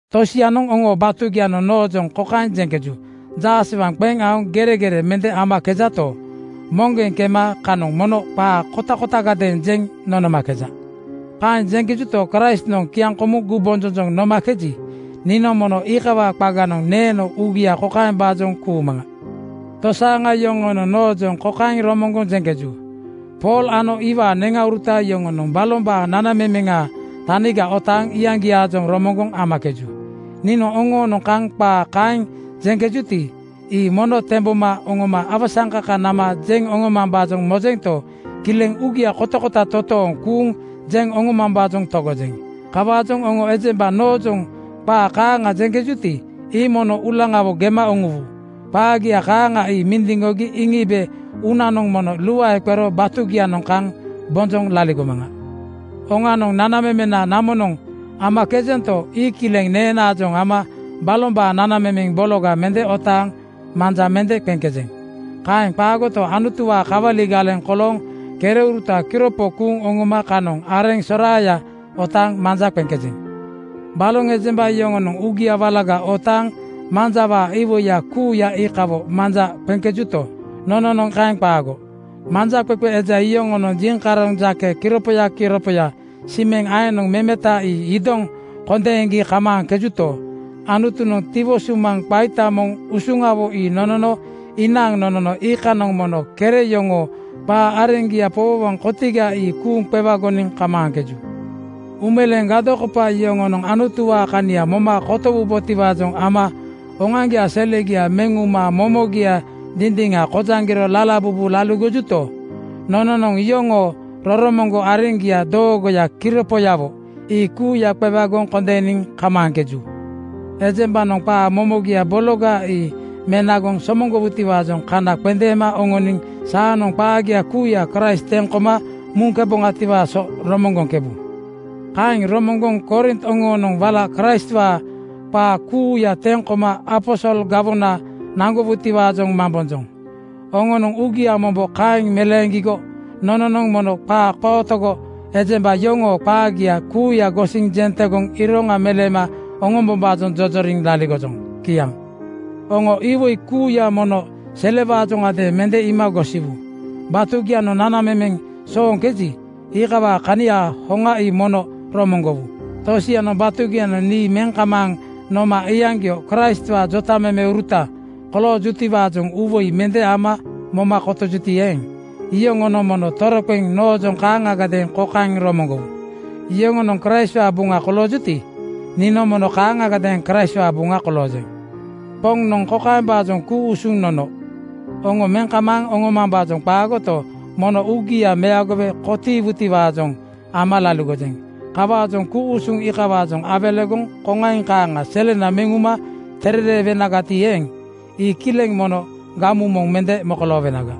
Tosianoŋ oŋoo batugianoŋ noojoŋ kokaeŋ jeŋkeju: Jaasewaŋ qeŋ aoŋ geregere mende amakejato, moŋgeŋ kema kanoŋ mono qaa kotakotagadeeŋ jeŋ nonomakeja. Kaeŋ jeŋkejuto, Kraistnoŋ kiaŋkomuŋ gumbonjonjoŋ nomakeji, niinoŋ mono iikawaa qaganoŋ neeno uugia kokaembaajoŋ kuumaŋa: Tosaaŋa yoŋonoŋ nonoojoŋ kokaeŋ romoŋgoŋ jeŋkeju, “Pool ano iwaa neŋauruta yoŋonoŋ balombaa nanamemeŋaa taniga otaaŋ iyaŋgiaajoŋ romoŋgoŋ amakeju.” Niinoŋ oŋoonoŋ kaŋ qaa kaeŋ jeŋkejuti, ii mono temboma oŋoma awasaŋkaka nama jeŋ oŋomambaajoŋ mojento, kileŋ uugia kotakota totooŋ kuuŋ jeŋ oŋomambaajoŋ togojeŋ. Kawaajoŋ oŋo ejemba noojoŋ qaa kaaŋa jeŋkejuti, ii mono uulaŋawo gema uŋuwu. Qaagia kaaŋa ii mindiŋgogi iŋiibe uunanoŋ mono luae qero batugianoŋ kaŋ bonjoŋ laligomaŋa. Oŋanoŋ, nanamemena namonoŋ amakejento, ii kileŋ neenaajoŋ ama balombaa nanamemeŋ bologa mende otaaŋ manja mende qeŋkejeŋ. Kaeŋ qaagoto, Anutuwaa kawali galeŋ kolooŋ kereuruta kiropo kuuŋ oŋoma kanoŋ areŋ soraaya otaaŋ manja qeŋkejeŋ. Baloŋ ejemba yoŋonoŋ uugia walaga otaaŋ manjawaa iwoiya kuuya iikawo manja qeŋkejuto, nononoŋ kaeŋ qaago. Manjaqeqe eja yoŋonoŋ jiŋkaroŋ jake kiripoya kiripoya simeŋ aeŋnoŋ memeta ii idoŋ kondeeŋgi kamaaŋkejuto, Anutunoŋ tiwo sumaŋ qaita moŋ usuŋawo ii nonono inaaŋ nonono iikanoŋ mono kere yoŋoo qaa areŋgia powowoŋ kotiga ii kuuŋ qewagoniŋ kamaaŋkeju. Uumeleembaa gadokopa yoŋonoŋ Anutuwaa kania moma kotowubotiwaajoŋ ama oŋoaŋgiaa selegia meŋ uma momogia dindiŋa kojaŋgiro lalabubu laligojuto, nononoŋ iyoŋoo roromoŋgo areŋgia doogoya kiripoyawo ii kuuya qewagoŋ kondeeniŋ kamaaŋkeju. Ejembanoŋ qaa momogia bologa ii menagoŋ somoŋgowutiwaajoŋ kana qendeema oŋoniŋ saanoŋ qaagia kuuya Kraist teŋ koma muŋkeboŋatiwaa so romoŋgoŋkebu. Kaeŋ romoŋgoŋ Korint oŋonoŋ wala Kraistwaa qaa kuuya teŋ koma aposol gawona naŋgowutiwaajoŋ mambonjoŋ. Oŋonoŋ uugia mombo kaeŋ meleeŋgigo nononoŋ mono qaa qootogo ejemba yoŋoo qaagia kuuya gosiŋ jeŋ tegoŋ iroŋa meleema oŋombombaajoŋ jojoriŋ laligojoŋ. Kiaŋ. Oŋo iwoi kuuya mono selewaajoŋadeeŋ mende iima gosiwu. Batugianoŋ nanamemeŋ sooŋkeji, iikawaa kaniaa hoŋa ii mono romoŋgowu. Tosianoŋ batugianoŋ nii meŋ kamaaŋ nooma iyaŋgio Kraistwaa jotamemeuruta koloojutiwaajoŋ uuwoi mende ama moma kotiijuti eeŋ, iyoŋonoŋ mono toroqeŋ noojoŋ kaaŋagadeeŋ kokaeŋ romoŋgowu: Yoŋonoŋ Kraistwaa buŋa koloojuti, niinoŋ mono kaaŋagadeeŋ Kraistwaa buŋa koloojeŋ. Poŋnoŋ kokaembaajoŋ ku-usuŋ nono: Oŋo meŋ kamaaŋ oŋoomambaajoŋ qaagoto, mono uugia meagowe kotiiwutiwaajoŋ ama laligojeŋ. Kawaajoŋ ku-usuŋ iikawaajoŋ awelegoŋ koŋaiŋ kaaŋa selena meŋ uma terereewenagati eeŋ, ii kileŋ mono gamu moŋ mende mokoloowenaga.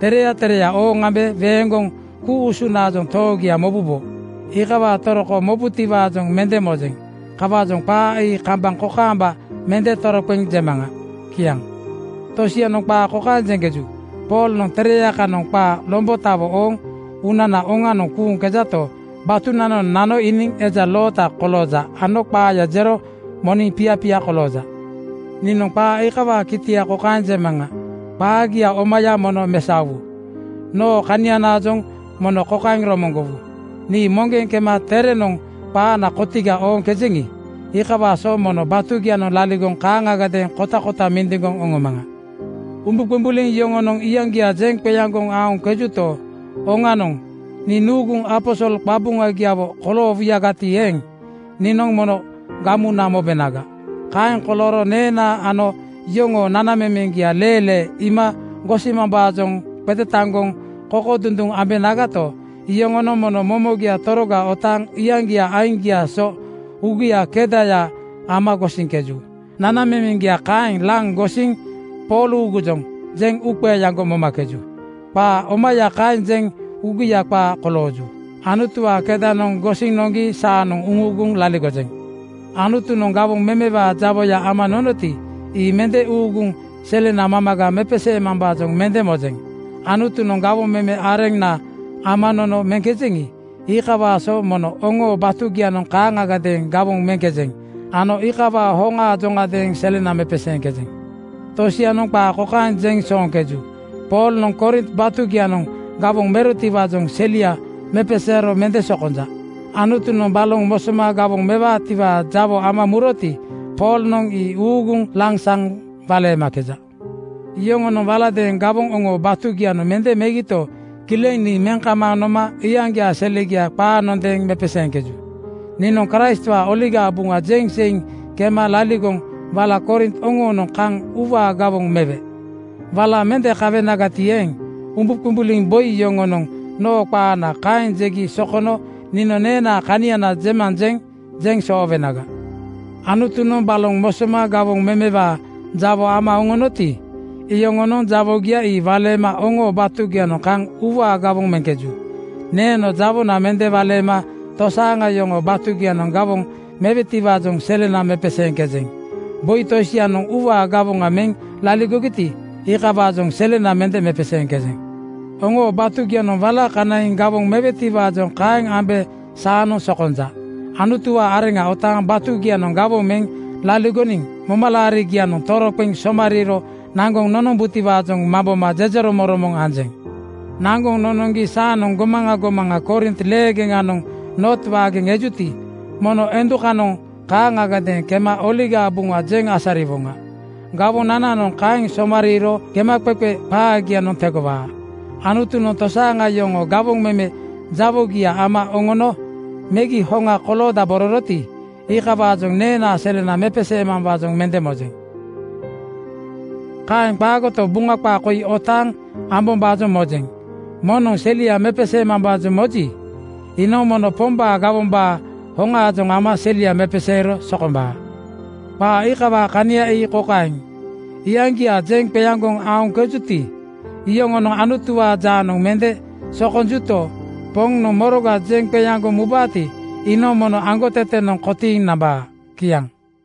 Tereya tereya ooŋ ambe weeŋgoŋ ku-usunaajoŋ toogia mobubo. Iikawaa toroko mobutiwaajoŋ mende mojeŋ. Kawaajoŋ qaa ii kambaŋ kokaamba mende toroqeŋ jemaŋa. Kiaŋ. Tosianoŋ qaa kokaeŋ jeŋkeju: Poolnoŋ tereya kanoŋ qaa lombotawo ooŋ uunana oŋanoŋ kuuŋkejato, batunananoŋ nano iiniŋ eja loota kolooja ano qaaya jero moniŋ piapiaya kolooja. Niinoŋ qaa iikawaa kitia kokaeŋ jemaŋa: Qaagia omaya mono mesaowu. Noo kanianaajoŋ mono kokaeŋ romoŋgowu: Nii moŋgeŋ kema terenoŋ qaana kotiga ooŋkejeŋi, iikawaa so mono batugianoŋ laligoŋ kaaŋagadeeŋ kotakota mindiŋgoŋ oŋomaŋa. Umbuqumbuliŋ yoŋonoŋ iyaŋgia jeŋ qeaŋgoŋ aoŋkejuto, oŋanoŋ nii nuuguŋ aposol qabuŋagiawo koloowuyagati eeŋ, niinoŋ mono gamuna mobenaga. Kaeŋ kolooro neenaa ano yoŋoo nanamemeŋgia leelee ama iima gosimambaajoŋ qetetaŋgoŋ kokodunduŋ ambenagato, yoŋonoŋ mono momogia toroga otaaŋ iyaŋgiaa aiŋgiaa so uugia kedaya ama gosiŋkeju. Nanamemeŋgia kaeŋ laŋ gosiŋ “Pool uugujoŋ,” jeŋ uuqeeaŋgo momakeju. Qaa omaya kaeŋ jeŋ uugia qaa kolooju. Anutuwaa kedanoŋ gosiŋ noŋgi saanoŋ uŋuuguŋ laligojeŋ. Anutunoŋ gawoŋ memewaa jawoya ama nonoti, ii mende uuguŋ selena mamaga mepeseemambaajoŋ mende mojeŋ. Anutunoŋ gawoŋ meme areŋna ama nono meŋkejeŋi, iikawaa so mono oŋoo batugianoŋ kaaŋagadeeŋ gawoŋ meŋkejeŋ ano iikawaa hoŋaajoŋadeeŋ selena mepeseeŋkejeŋ. Tosianoŋ qaa kokaeŋ jeŋ sooŋkeju, “Poolnoŋ Korint batugianoŋ gawoŋ merotiwaajoŋ selia mepeseero mende sokonja. Anutunoŋ baloŋ mosoma gawoŋ mewaatiwaa jawo ama muroti, Poolnoŋ ii uuguŋ lansaŋ waleemakeja.” Yoŋonoŋ waladeeŋ gawoŋ oŋoo batugianoŋ mende megito, kileŋ nii meŋ kamaaŋ nooma iyaŋgiaa selegia qaanondeeŋ mepeseeŋkeju. Niinoŋ Kraistwaa Oligaa Buŋa jeŋ seiŋ kema laligoŋ wala Korint oŋoonoŋ kaŋ uuwaa gawoŋ mewe. Wala mende kawenagati eeŋ, umbuqumbuliŋ boi yoŋonoŋ noo qaana kaeŋ jegi sokono niinoŋ neenaa kaniana jemaŋ jeŋ jeŋ soowenaga. Anutunoŋ baloŋ mosoma gawoŋ memewaa jawo ama oŋonoti, iyoŋonoŋ jawogia ii waleema oŋoo batugianoŋ kaŋ uuwaa gawoŋ meŋkeju. Neeno jawona mende waleema tosaaŋa yoŋoo batugianoŋ gawoŋ mewetiwaajoŋ selena mepeseeŋkejeŋ. Boi tosianoŋ uuwaa gawoŋ meŋ laligogiti, iikawaajoŋ selena mende mepeseeŋkejeŋ. Oŋoo batugianoŋ wala kanaiŋ gawoŋ mewetiwaajoŋ kaeŋ ambe saanoŋ sokonja. Anutuwaa areŋa otaaŋ batugianoŋ gawoŋ meŋ laligoniŋ momalaarigianoŋ toroqeŋ somariiro naŋgoŋ nonombutiwaajoŋ mamboma jejeromoŋromoŋ anjeŋ. Naŋgoŋ nonoŋgi saanoŋ gomaŋa gomaŋa Korint leegeŋanoŋ Noot waageŋ ejuti, mono endukanoŋ kaaŋagadeeŋ kema Oligaa Buŋa jeŋ asariwoŋa. Gawonananoŋ kaeŋ somariiro gemaqeqe qaagianoŋ tegowaa. Anutunoŋ tosaaŋa yoŋoo gawoŋ meme jawogia ama oŋono megi hoŋa koloodabororoti, iikawaajoŋ neenaa selena mepeseemambaajoŋ mende mojeŋ. Kaeŋ qaagoto, Buŋa qaa koi otaaŋ amambaajoŋ mojeŋ, “Moŋnoŋ selia mepeseemambaajoŋ moji, iinoŋ mono Pombaa gawombaa hoŋaajoŋ ama selia mepeseero sokombaa.” Qaa iikawaa kania ii kokaeŋ: Iyaŋgia jeŋ qeaŋgoŋ aoŋkejuti, iyoŋonoŋ Anutuwaa jaanoŋ mende sokonjuto, Poŋnoŋ moroga jeŋ qeaŋgoŋ mubaati, iinoŋ mono aŋgotetenoŋ kotiiŋ nambaa. Kiaŋ.